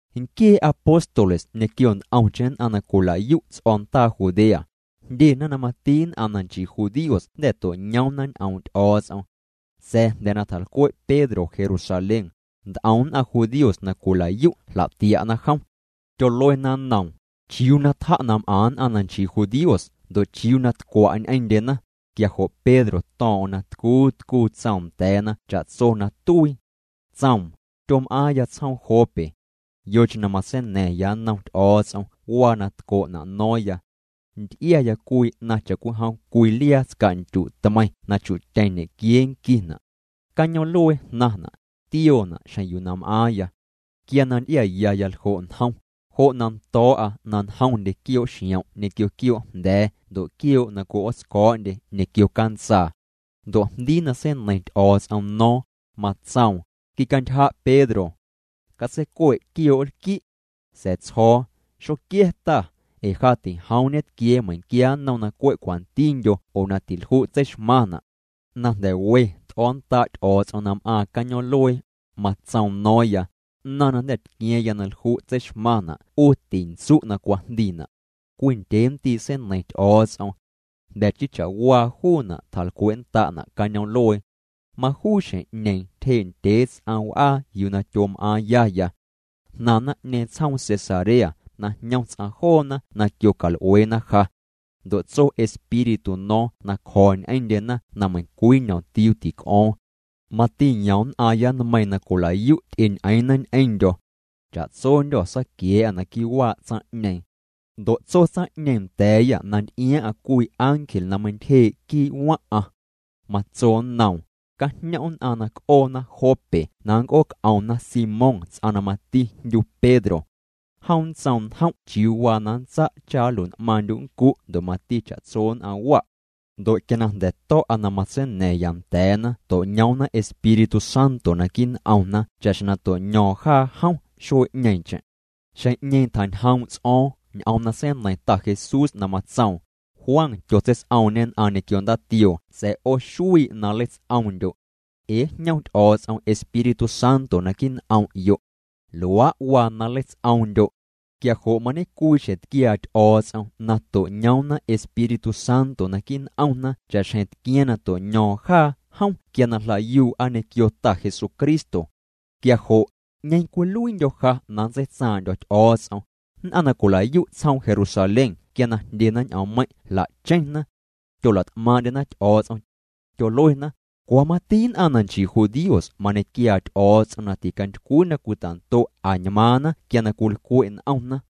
Nquiee apóstoles ñequio nt'omcheⁿ nn'aⁿ na cwilayu' ts'o̱ndaa Judea, jndyena na mati nn'aⁿ na nchii judíos jnda̱ to'ñoomna ñ'oom' Ty'o̱o̱ts'om. Sa̱a̱ jnda̱ na tjalcwe' Pedro Jerusalén, nt'om nn'aⁿ judíos na cwilayu' jla'tia'na jom. Tyoluena nnoom: —¿Chiuu na tja' na m'aⁿ nn'aⁿ na nchii judíos ndo' chiuu na tcwa' ñ'eⁿndyena? Quia jo' Pedro to̱o̱ⁿ'o̱ⁿ na tcuu tcuu tsoom nda̱a̱na cha'tso na tuii. Tsoom: —Tyom'aaⁿya tsjoom Jope. Yocheⁿ na matseina̱ⁿya nnom Ty'o̱o̱ts'om waa na tco'na' no̱o̱ⁿya. Nty'iaya cwii 'naⁿ cha'cwijom cwii liaa tsca'ndyu' tmeiⁿ na chu'tyeⁿ ñequiee nquina'. Cañoom'luee jnaⁿna', tioona' xjeⁿ yuu na m'aaⁿya. Quia na nty'iayaya ljo' njom, jo' na ndo̱o̱'a na njom quioo' xiom' ñequio quioo' jnda̱a̱ ndo' quioo' na cwi'ootsco̱o̱'ndye ñequio cantsaa. Ndo' jndii na seineiⁿ Ty'o̱o̱ts'om no̱o̱ⁿ, matsoom: “Quicantyja' Pedro. Catseicue' quioo' nlqui'.” Sa̱a̱ tsjo̱o̱: “Xoquia̱ Ta, ee ja tijoom ñetquia̱a̱ meiⁿnquia nnom na cwe' cwantindyo oo na tilju' tseixmaⁿna'.” Na jnda̱ we t'o̱nnda' Ty'o̱o̱ts'om na m'aaⁿ cañoom'luee, matsoom no̱o̱ⁿya: “'Naⁿ na jnda̱ tqua̱a̱ⁿya na lju' tseixmaⁿna' 'u tintsu' na cwajndiina'.” Cwii ndyee ndii' seineiⁿ Ty'o̱o̱ts'om. Jnda̱ chii cha'waa juuna' tjalcwe'nnda'na' cañoom'luee. Majuu xjeⁿ'ñeeⁿ tyjee' ndyee ts'aⁿ w'aa yuu na tyom'aaⁿyaya. Jnaⁿ naⁿ'ñeeⁿ tsjoom Cesarea na jñom ts'aⁿ joona na quiocal'ueena ja. Ndo' tso Espíritu no̱o̱ⁿ na cjo̱ ñ'eⁿndyena na meiⁿcwii ñomtiuu tic'o̱o̱ⁿ. Mati yom nn'aaⁿya nmeiiⁿ na cwilayu' ty'eñ'eeⁿna ñ'eⁿndyo̱. Cha'tsondyô̱ saquia̱a̱'â naquii' waa' tsaⁿ'ñeeⁿ. Ndo' tso tsaⁿ'ñeeⁿ nda̱a̱yâ na nty'iaaⁿ'aⁿ cwii ángel na meintyjee' quii' waⁿ'aⁿ. Matso nnoom: “Cajñom' nn'aⁿ na c'oona Jope na nnc'ooc'omna Simón tsaⁿ na mati jndyu Pedro. Jom nntsoom njom' chiuu waa na nntsa' cha nlui'n'maaⁿndyu' nncu' ndo' mati cha'tso nn'aⁿ wa'.” Ndo' quia jnda̱ to̱'a na matseina̱ⁿya nda̱a̱na to'ñoomna Espíritu Santo naquii' n'omna cha'xjeⁿ na to'ño̱o̱ⁿ jaa jom xuee'ñeeⁿcheⁿ. Xjeⁿ'ñeeⁿ tjañjoom' ts'o̱o̱ⁿ ñ'oom na seineiⁿ Ta Jesús na matsoom: “Juan tyotseits'oomñê nn'aⁿ ñequio ndaatioo sa̱a̱ 'o xuii' na nleits'oomndyo'. Ee njñom Ty'o̱o̱ts'om Espíritu Santo naquii' n'om'yo'. Luaa' waa na nleits'oomndyo'.” Quia jo' mañecwii xjeⁿ tquiaa Ty'o̱o̱ts'om na to'ñoomna Espíritu Santo naquii' n'omna cha'xjeⁿ tquiaaⁿ na to'ño̱o̱ⁿ jaa jom quia na jlayuu'a ñequio Ta Jesucristo. Quia jo' ¿'ñeeⁿ cwiluiindyo̱ ja na nntseitsaaⁿ'ndyo̱ Ty'o̱o̱ts'om? Nn'aⁿ na cwilayu' tsjoom Jerusalén quia na jndyena ñ'oommeiⁿ' jla'cheⁿna. Tyolat'maaⁿ'ndyena Ty'o̱o̱ts'om. Tyoluena: —Cwa mati nn'aⁿ na nchii judíos mañequiaa Ty'o̱o̱ts'om na ticantycwii na cwitando' añmaaⁿna quia cwilcwe' n'omna.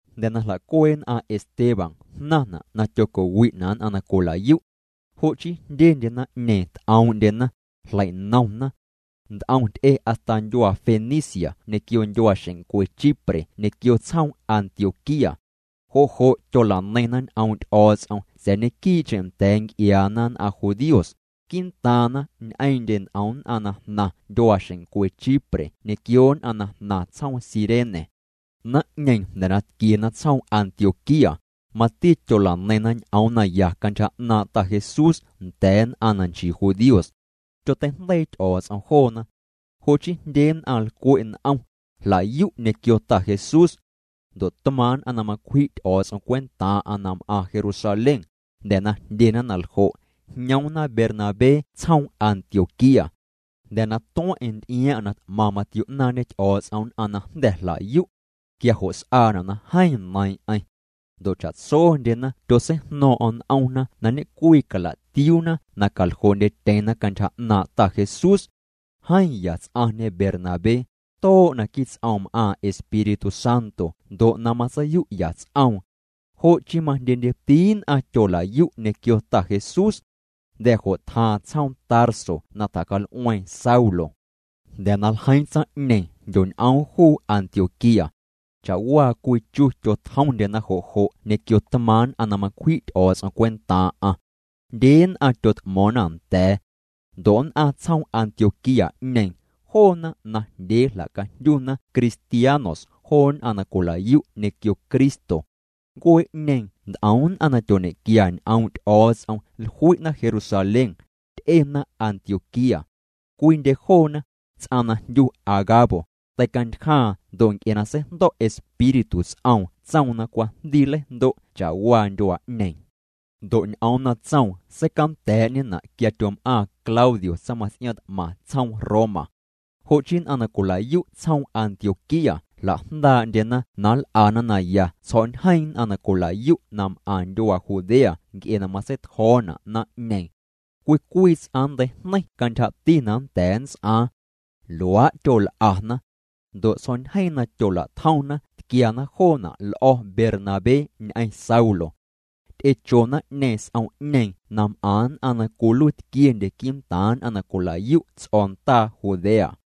Jnda̱ na jla'cuee' nn'aⁿ Esteban jnaⁿna' na tyoco'wi'na' nn'aⁿ na cwilayu'. Jo' chii jndyendye naⁿ'ñeeⁿ t'oom'ndyena, jleinomna. Nt'om ty'e hasta ndyuaa Fenicia ñequio ndyuaaxeⁿncwe Chipre ñequio tsjoom Antioquía. Jo' jo' tyola'neiⁿna ñ'oom' Ty'o̱o̱ts'om sa̱a̱ ñequii'cheⁿ nda̱a̱ nc'iaana nn'aⁿ judíos, quii'ntaaⁿna ñ'eeⁿ'ndye nt'om nn'aⁿ na jnaⁿ ndyuaaxeⁿncwe Chipre ñequio nn'aⁿ na jnaⁿ tsjoom Cirene. Naⁿ'ñeeⁿ jnda̱ na tquiena tsjoom Antioquía, mati tyola'neiⁿna ñ'oom naya cantyja 'naaⁿ' Ta Jesús nda̱a̱ nn'aⁿ na nchii judíos. Tyoteijndeii Ty'o̱o̱ts'om joona. Jo' chii jndye nn'aⁿ lcwe' n'om, jlayu' ñequio Ta Jesús. Ndo' tmaaⁿ' nn'aⁿ na macwji' Ty'o̱o̱ts'om cwentaaⁿ'aⁿ na m'aⁿ Jerusalén, jnda̱ na jndyena na ljo', jñoomna Bernabé tsjoom Antioquía. Jnda̱ na tueⁿ'eⁿ nty'iaaⁿ'aⁿ na t'maⁿ matio'naaⁿñe Ty'o̱o̱ts'om nn'aⁿ na jnda̱ jlayu'. Quia jo' s'aana' na jeeⁿ neiiⁿ'eⁿ. Ndo' cha'tsondyena tyotseijno̱o̱ⁿ'o̱ⁿ n'omna na ñe'cwii cala'tiuuna na caljoo'ndyetyeⁿna cantyja 'naaⁿ' Ta Jesús. Jeeⁿ ya ts'aⁿñe Bernabé, too' naquii ts'oom m'aaⁿ Espíritu Santo ndo' na matseiyu'ya ts'oom. Jo' chii majndyendyeti nn'aⁿ tyolayu' ñequio Ta Jesús. Jnda̱ jo' tjaaⁿ tsjoom Tarso na tjacal'ueeⁿ Saulo. Jnda̱ na ljeiiⁿ tsaⁿ'ñeeⁿ jndyoñ'oom juu Antioquía. Cha'waa cwii chu tyotjomndyena jo' jo' ñequio tmaaⁿ' nn'aⁿ na macwji' Ty'o̱o̱ts'om cwentaaⁿ'aⁿ. Jndye nn'aⁿ tyot'mo̱o̱ⁿna nda̱a̱. Ndo' nn'aⁿ tsjoom Antioquía'ñeeⁿ, joona najndyee jla'cajndyuuna cristianos joo nn'aⁿ na cwilayu' ñequio Cristo. Ncuee'ñeeⁿ nt'om nn'aⁿ na tyoñe'quia ñ'oom' Ty'o̱o̱ts'om jlui'na Jerusalén, ty'ena Antioquía. Cwiindye joona, ts'aⁿ na jndyu Agabo, teicantyjaaⁿ ndo' nc'e na seijndo̱' Espíritu ts'oom tsoom na cwajndii nleijndo' cha'waa ndyuaa'ñeeⁿ. Ndo' ñ'oom na tsoom seicanda̱a̱'ñena' quia tyom'aaⁿ Claudio tsaⁿmaⁿts'iaaⁿ t'maⁿ tsjoom Roma. Jo' chii nn'aⁿ na cwilayu' tsjoom Antioquía jla'jndaa'ndyena na nl'ana naya tsjo̱'ñjeeⁿ nn'aⁿ na cwilayu' na m'aⁿ ndyuaa Judea nc'e na matseitjo̱o̱na' naⁿ'ñeeⁿ. Cwii cwii ts'aⁿ nnteijneiⁿ cantyjati na nnda̱a̱ nnts'aaⁿ. Luaa' tyol'ana. Ndo' tsjo̱'ñjeeⁿ na tyola'tjomna tquiana joona' l'o̱ Bernabé ñ'eⁿ Saulo. Ty'echo naⁿ'ñeeⁿ s'om'ñeeⁿ na m'aⁿ nn'aⁿ na cwiluiitquiendye quii'ntaaⁿ nn'aⁿ na cwilayu' ts'o̱ndaa Judea.